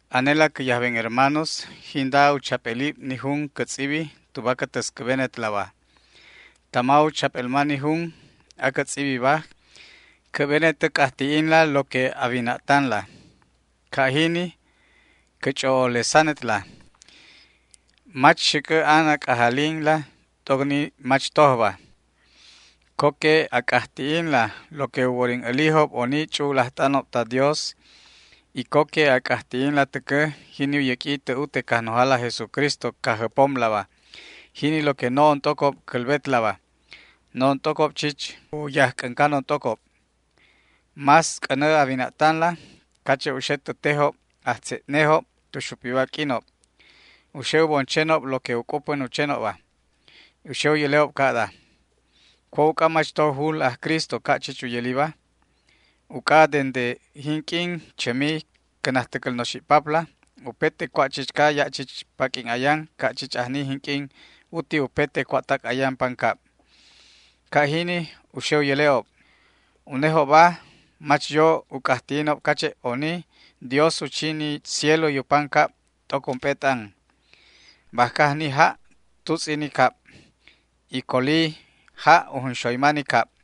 Anela cä yajben hermanos, jinda u chap'elib ni jun cä tz'ibi tuba cä täscäbenetlaba. Tama u chap'elma ni jun acä tz'ibiba, cä'benet a c'ajti'inla lo que a wina'tanla. Ca' jini cä ch'o'olesanetla. Mach xäc'ä an a c'ajalinla t'oc ni mach tojba. Co que a c'ajti'inla lo que u worin älijob oni ch'u'ul ajt'anob ta Dios, y co que a c'ajti'inla täcä jini u yäq'ui tä ute Cajnojala aj Jesucristo Cajjäpomlaba, jini lo que no'on t'ocob cälbetlaba. No'on t'ocob chich u yajc'äncanon t'ocob. Más c'änä a wina'tanla cache' u xe tä tejob ajtze'nejob tu xupiba q'uinob. U xe u bon chenob lo que u c'upän u chenobba. U xe u yäle'ob ca'da: “¿Cua' uc'a mach to jul aj Cristo ca' chich u yäliba? Uc'a dende jinq'uin chämi cä najtäcäl noxi'papla upete cua' chichca ya' chich paq'uin ayan ca' chich ajni jinq'uin uti upete cua'tac ayan pancab”. Ca' jini u xe u yäle'ob. Unejobba mach yo u c'ajti'inob cache' oni Dios u chi ni cielo y u pancab t'oc ump'e t'an. Bajca ajni ja' tutz'i ni cab, y colobi ja' u junxoyma ni cab.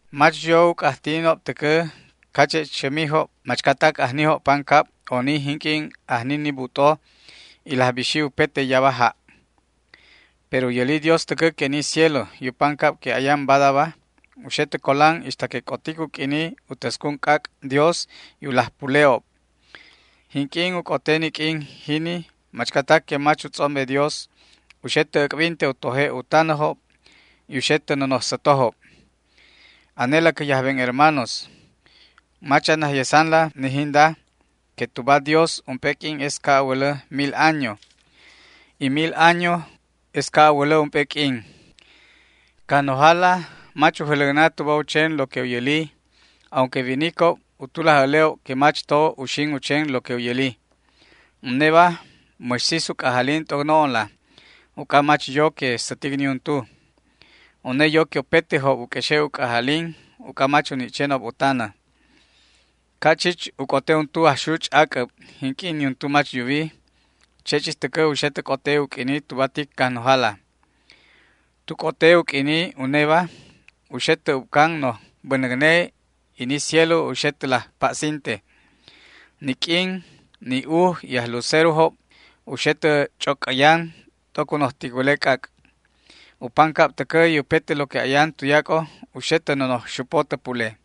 Mach yo u c'ajti'inob täcä cache' chämijob machcatac ajnijob pancab oni jinq'uin ajni ni but'o y laj bixi upete yaba ja'. Pero u yäli Dios täcä que ni cielo y u pancab que ayan badaba u xe tä colan ixta que c'otic u q'uini u täscun c'ac' Dios y u laj pule'ob. Jinq'uin u c'ote ni q'uin jini machcatac que mach u tz'ombe Dios u xe tä äc'binte u toje' u tanäjob y u xe tä nonoj sätojob. Anela cä yajben hermanos, mach a najyesanla ni jinda, que tuba Dios ump'e q'uin es ca' a wälä mil año, y mil añoba tuba une es ca' a wälä ump'e q'uin. Cajnojala mach u jäläcna tuba u chen lo que u yäli, aunque winicob u tulaj äle'ob que mach to uxin u chen lo que u yäli. Uneba mäx sis u c'ajalin t'oc no'onla uc'a mach yo que sätic niuntu. Une yo que upetejob u q'uexe' u c'ajalin uc'a mach u ni' chenob u tanä. Ca' chich u c'ote untu ajxuch' ac'äb jinq'uin niuntu mach yuwi, che' chich täcä u xe tä c'ote u q'uini tuba tic Cajnojala. Tu c'ote u q'uini uneba u xe tä ubcan noj bänäcne y ni cielo u xe tä laj pa'sinte. Ni q'uin, ni uj y ajlucerojob u xe tä ch'ocäyan t'oc u noj ticwäle c'ac'. U pancab täcä y upete lo que ayan tuyac'o u xe tä nonoj xupo tä pule.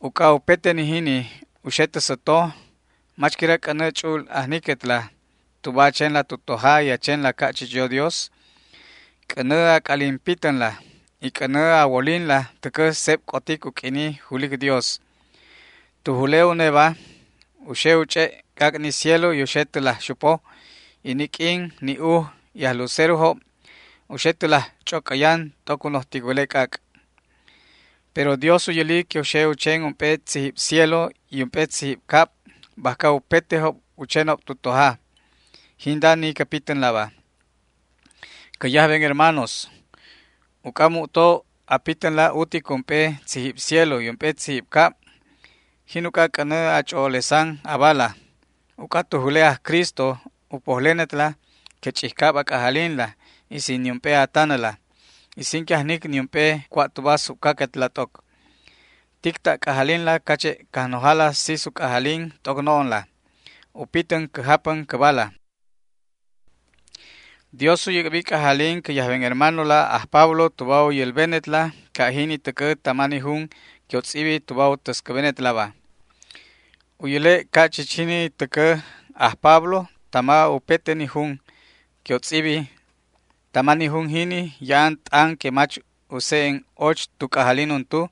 Uc'a upete ni jini u xe tä säto, ¿mach quira c'änä ch'u'ul ajniquetla tuba a chenla tu toja y a chenla ca' chich yo Dios? C'änä a c'alin pitänla y c'änä a wolinla täcä seb c'otic u q'uini julic Dios. Tu jule uneba u xe u ch'e' c'ac' ni cielo y u xe tä laj xupo, y ni q'uin, ni uj y ajlucerojob u xe tä laj ch'ocäyan t'oc u noj ticwäle c'ac'. Pero Dios u yäli que u xe u chen ump'e tzijib cielo y ump'e tzijib cab bajca upetejob u chenob tu toja. Jinda ni cä pitänlaba. Cä yajben hermanos, uc'a mu'to a pitänla utic ump'e tzijib cielo y ump'e tzijib cab, jin uc'a c'änä a ch'o'olesan abala, uc'a tu jule aj Cristo u pojlenetla que ch'ijcab a c'ajalinla, y sin niump'e a tanäla y sin que ajnic niump'e cua' tuba subcaquetla t'oc. Tic ta' c'ajalinla cache' Cajnojala sis u c'ajalin t'oc no'onla u pitän cä japän cäbala. Dios u yäc'bi c'ajalin cä yajben hermanola aj Pablo tuba u yälbenetla ca' jini täcä tama ni jun que u tz'ibi tuba u täscäbenetlaba. U yäle' ca' chich jini täcä aj Pablo tama upete ni jun que u tz'ibi. Tama ni jun jini ya'an t'an que mach u se'en och tu c'ajalin untu,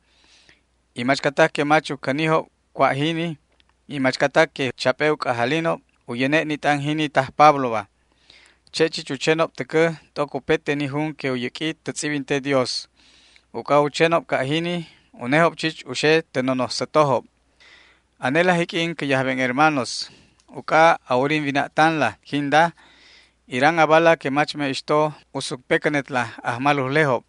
y machcatac que mach u cänijob cua' jini y machcatac que chap'e u c'ajalinob u yäne' ni t'an jini taj Pabloba. Che' chich u chenob täcä t'oc upete ni jun que u yäq'ui tä tz'ibinte Dios. Uc'a u chenob ca' jini, unejob chich u xe tä nonoj sätojob. Anela jiq'uin cä yajben hermanos, uc'a a worin wina'tanla jinda, iran abala que mach me'ixto u sucpecänetla ajmalujlejob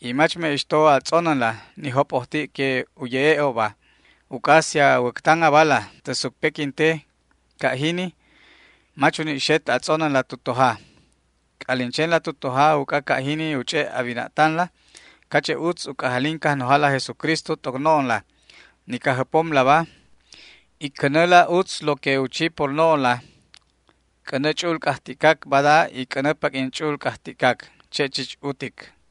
y mach me'ixto a tz'onänla ni jop'ojti' que u ye'e'obba. Uc'a si a wäctan abala tä sucpequinte ca' jini mach uni' xet a tz'onänla tu toja. C'alin chenla tu toja uc'a ca' jini u ch'e' a wina'tanla cache' utz u c'ajalin Cajnojala aj Jesucristo t'oc no'onla, ni Cajjäpomlaba, y cänäla utz lo que u chi por no'onla. C'änä ch'u'ul c'ajti'cac bada y c'änä paq'uin ch'u'ul c'ajti'cac. Che' chich utic.